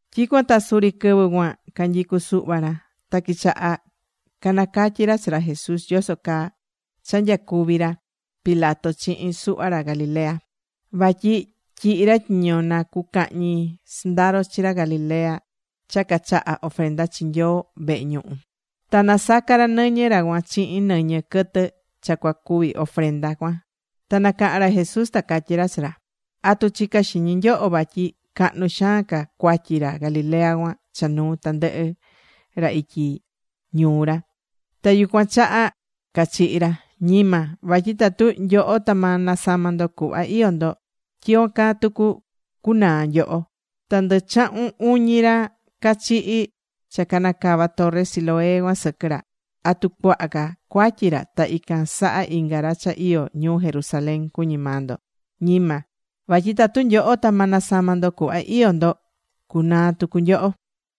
Tyicuan ta suri quɨvɨ cuan canyicu suhva ra. Ta quichaha canacatyi ra chi ra Jesús yoso caa cha nyacuvi̱ ra Pilato chihin suhva ra Galilea. Vatyi tyihi ra tyiño na cucahñi sɨndaro chi ra Galilea cha cachaha̱ ofrenda chi Nyoo vehe ñuhu. Ta nasaca̱ ra nɨñɨ ra cuan chihin nɨñɨ quɨtɨ cha cua cuvi ofrenda cuan. Ta nacaha̱n ra Jesús ta catyí ra chi ra: ―¿Atu chicá xiñi nyoho vatyi cahnu xaan ca cuatyi ra Galilea cuan cha nuu tandɨhɨ ra ityi ñuu ra. Ta yucuan chaha cachihi̱ ra? Ñima. Vatyi tatu nyoho ta ma nasama ndo cuhva iyó ndo, tyicuan caa tucu cunaa nyoho. Ta ndɨ chahun uñi ra cachihi̱ cha canacava̱ torre Siloé cuan sɨquɨ ra. ¿Atu cuaha ca cuatyi ra ta ican saha inga ra cha iyó ñuu Jerusalén cuñí maa ndo? Ñima. Vatyi tatu nyoho ta ma nasama ndo cuhva iyó ndo, cunaa tucu nyoho.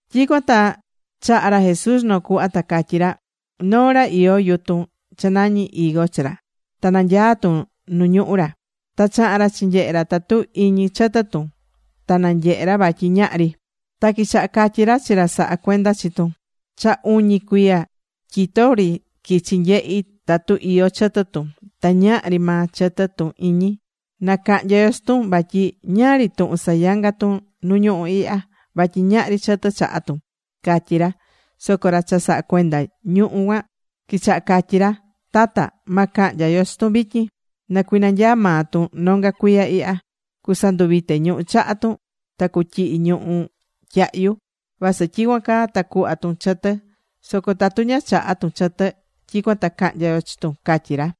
Tyicuan ta chaha̱ ra Jesús noo cuhva. Ta catyí ra: ―Noo ra iyó yutun cha nañí higo chi ra. Ta nanyaá tun nu ñuhú ra. Ta chaha̱n ra chinyehe ra tatu iñi chɨtɨ tun. Ta nanyehe ra vatyi ñahri. Ta quichaha catyí ra chi ra sahá cuenda chi tun: “Cha uñi cuiya tyito ri quichi nyehi tatu iyó chɨtɨ tun. Ta ñahri maa chɨtɨ tun iñi. Na cahnya yo chi tun. Vatyi ¿ñáá ri tuhun sayangá tun nu ñuhú ihya? Vatyi ñahri chɨtɨ chahá tun”, catyí ra. Soco ra cha sahá cuenda ñuhú cuan quichaha catyí ra: “Tata, ma cahnya yo chi tun vityin. Na cuinanyaa maa tun nonga cuiya ihya. Cusanduvite ñuhú chaha tun ta cutyihi ñuhú tyahyu. Vasɨ tyicuan caa ta cuhva tun chɨtɨ. Soco tatu ña chaha tun chɨtɨ, tyicuan ta cahnya yo chi tun”, catyí ra.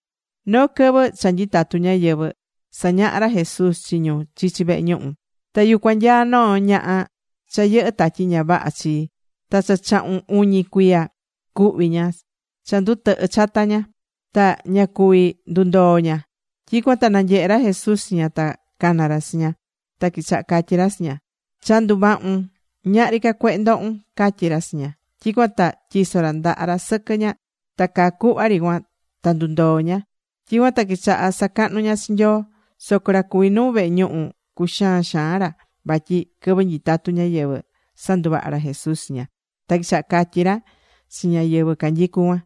Noo quɨvɨ cha nyitatú ñáyɨvɨ sañahá ra Jesús chi ñu chichi vehe ñuhu. Ta yucuan nyaá noo ñaha cha yɨhɨ́ tatyi ña vaha chi. Ta cha chahun uñi cuiya cuhví ña cha ndutɨhɨ chata ña. Ta ña cuví ndundoo ña. Tyicuan ta nanyehe̱ ra Jesús chi ña. Ta cana̱ ra chi ña. Ta quichaha catyi ra chi ña: ―Cha nduvahu̱n. Ñahri ca cuehe ndohún ―catyí ra chi ña. Tyicuan ta tyiso̱ ra ndaha ra sɨquɨ ña. Ta caa cuhva ri cuan ta ndundoo̱ ña. Tyicuan ta quichaha sacahnu ña chi Nyoo. Soco ra cuví nuu vehe ñuhu, cuxaan xaan ra. Vatyi quɨvɨ nyitatú ñáyɨvɨ sanduvaha̱ ra Jesús chi ña. Ta quichaha catyí ra chi ñáyɨvɨ canyicú cuan: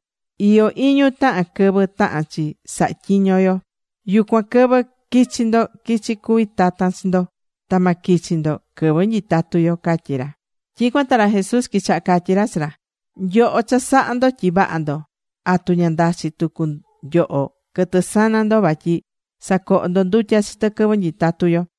―Iyó iñu tahan quɨvɨ tahán chi saha tyiño yo. Yucuan quɨvɨ quichi ndo quichi cuvi tatan chi ndo. Ta ma quichi ndo quɨvɨ nyitatu yo ―catyí ra. Tyicuan ta ra Jesús quichaha catyí ra chi ra: ―Nyoho cha sahá ndo tyi vaha ndo. ¿Atu ña ndachi tucu nyoho quɨtɨ sana ndo vatyi sacoho ndo ndutya chi tɨ quɨvɨ nyitatú yo?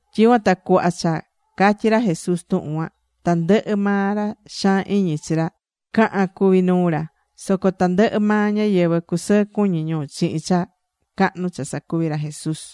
Tyicuan ta cuhva cha catyí ra Jesús tuhun cuan, tandɨhɨ maa ra xaan iñi chi ra caha̱n cuvi nuu ra. Soco tandɨhɨ maa ñáyɨvɨ cusɨɨ cuñi ñu chihin cha cahnu cha sacuví ra Jesús.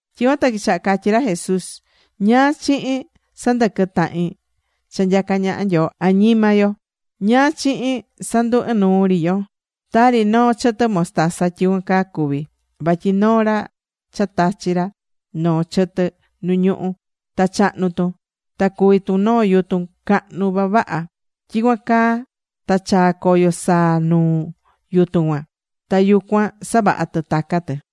Tyicuan ta quichaha catyí ra Jesús: ―¿Ñáá chihin sandɨquɨ tahin cha nyacá ñaha Nyoo añima yo? ¿Ñáá chihin sandu ɨnuu ri yo? Tari noo chɨtɨ mostaza, tyicuan caa cuví. Vatyi noo ra tachi̱ ra noo chɨtɨ nu ñuhú, ta chahnu̱ tun. Ta cuví tun noo yutun cahnu vavaha. Tyicuan ta chaá coyo saa nuu yutun cuan. Ta yucuan savahá tɨ taca tɨ.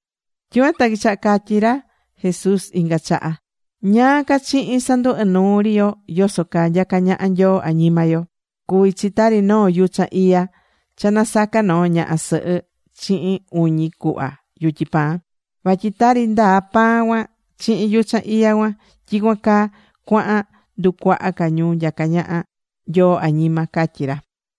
Tyicuan ta quichaha catyí ra Jesús inga chaha: ―¿Ñáá ca chihin sandu inuu ri yo yoso caa nyacá ñaha Nyoo añima yo? Cuví chi tari noo yuchan iya cha nasaca̱ noo ñaha sɨhɨ chihin uñi cuhva yutyi pan. Vatyi tari ndaa pan cuan chihin yuchan iya cuan, tyicuan caa cuahan nducuaha ca ñu nyacá ñaha Nyoo añima ―catyí ra.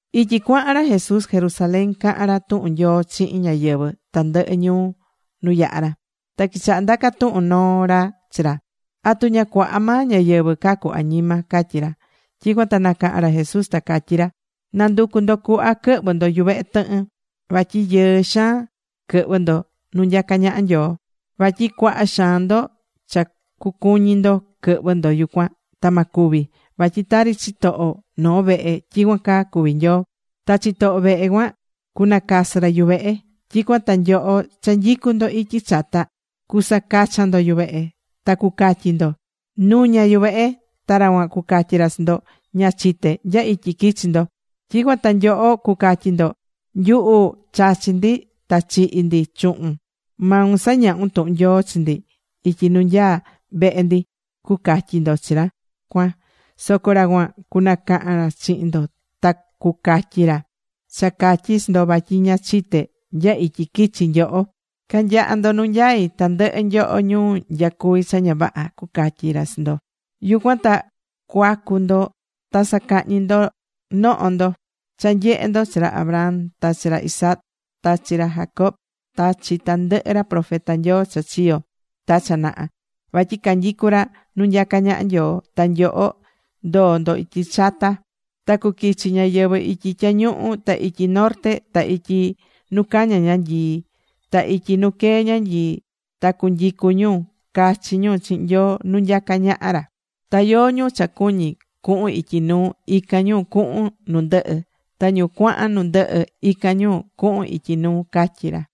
Ityi cuahan ra Jesús Jerusalén cahán ra tuhun Nyoo chihin ñáyɨvɨ tandɨhɨ ñuu nu yaha̱ ra. Ta quichaha ndaca tuhun noo ra chi ra: ―¿Atu ña cuaha maa ñáyɨvɨ cucacu añima? ―catyí ra. Tyicuan ta nacaha̱n ra Jesús, ta catyí ra: ―Na̱nducu ndo cuhva quɨhvɨ ndo yuvehe tɨhɨn. Vatyi yɨɨ xaan quɨhvɨ ndo nu nyacá ñaha Nyoo. Vatyi cuaha xaan ndo cha cucuñi ndo quɨhvɨ ndo yucuan. Ta ma cuvi. Vatyi tari chitoho noo vehe tyicuan caa cuví Nyoo. Ta chitoho vehe cuan cunacasɨ ra yuvehe. Tyicuan ta nyoho cha nyicú ndo ityi chata cusacachan ndo yuvehe, ta cucatyi ndo: “Nu̱ña yuvehe.” Ta ra cuan cucatyi ra chi ndo: “Ña chité nya ityi quichi nyoho.” Tyicuan ta nyoho cucatyi ndo: “Nyuhu chachi̱ ndi ta chihi̱ ndi chuhun. Maun sañahu̱n tuhun Nyoo chi ndi ityi nu nyaá vehe ndi”, cucatyi ndo chi ra cuan. Soco ra cuan cunacahan ra chihin ndo ta cucatyi ra: “Cha catyi chi ndo vatyi ña chité nya ityi quichi nyoho. Ca̱nyaha ndo nu nyai, tandɨhɨ nyoho ñu nyacuví cha ña vaha”, cucatyi ra chi ndo. Yucuan ta cuacu ndo ta sacahñi noho ndo cha nyehe ndo chi ra Abraham ta chi ra Isaac ta chi ra Jacob, ta chi tandɨhɨ ra profeta Nyoo cha chiyo ta cha naha. Vatyi canyicú ra nu nyacá ñaha Nyoo. Ta nyoho ndoo ndo ityi chata. Ta cuquichi ñáyɨvɨ ityi tyañuhu, ta ityi norte, ta ityi nu caña ñanyii, ta ityi nu quee ñanyii. Ta cunyicu ñu cachi ñu chihin Nyoo nu nyacá ñaha ra. Ta yóó ñu cha cuñí cuhun ityi nuu, ican ñu cuhun nu ndɨhɨ. Ta ñu cuahan nu ndɨhɨ, ican ñu cuhun ityi nuu ―catyí ra.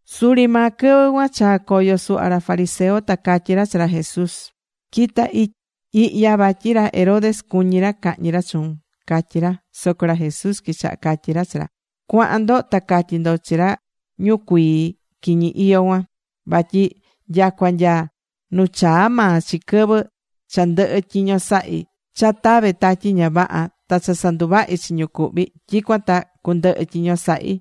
Suri maa quɨvɨ cuan chaa̱ coyo suhva ra fariseo. Ta catyí ra chi ra Jesús: ―Qui̱ta ihya vatyi ra Herodes cuñí ra cahñi ra chuun ―catyí ra. Soco ra Jesús quichaha catyi ra chi ra: ―Cua̱han ndo ta catyi ndo chi ra ñucuii quiñi iyó cuan, vatyi nyacua nya nu chaa maa chi quɨvɨ cha ndɨhɨ tyiño sahí cha tave tatyi ña vaha ta cha sanduvahi chi ñu cuhví, tyicuan ta cundɨhɨ tyiño sahí.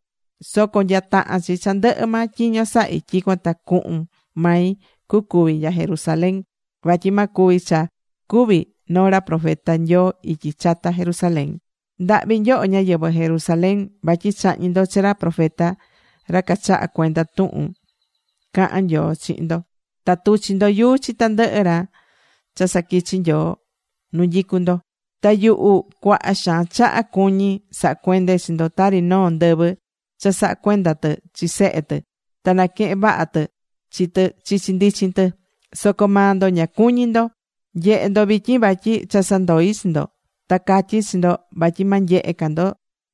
Soco nya tahán chi cha ndɨhɨ maa tyiño sahí, tyicuan ta cuhun mai cucúvi nya Jerusalén. Vatyi ma cuvi cha cúvi noo ra profeta Nyoo ityi chata Jerusalén. ¡Ndahvi nyoho ñáyɨvɨ Jerusalén! vatyi chahñí ndo chi ra profeta ra cachahá cuenda tuhun cahán Nyoo chi ndo. Ta tuchi ndo yuu chi tandɨhɨ ra cha saquichi̱ Nyoo nu nyicú ndo. Ta yuhu cuaha xaan chaha cuñí saha cuende chi ndo tari noo ndɨvɨ cha sahá cuenda tɨ chi sehe tɨ, ta naquehen vaha tɨ chi tɨ chichi ndichin tɨ. Soco maa ndo ña cuñí ndo. Nye̱he ndo vityin vatyi cha sandoi̱ chi ndo. Ta catyí chi ndo vatyi ma nyehe ca ndo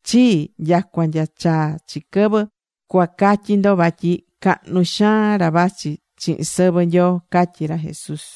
chii nyacua nya chaa chi quɨvɨ cuacatyi ndo vatyi cahnu xaan ra vachi chihin sɨvɨ Nyoo ―catyi ra Jesús.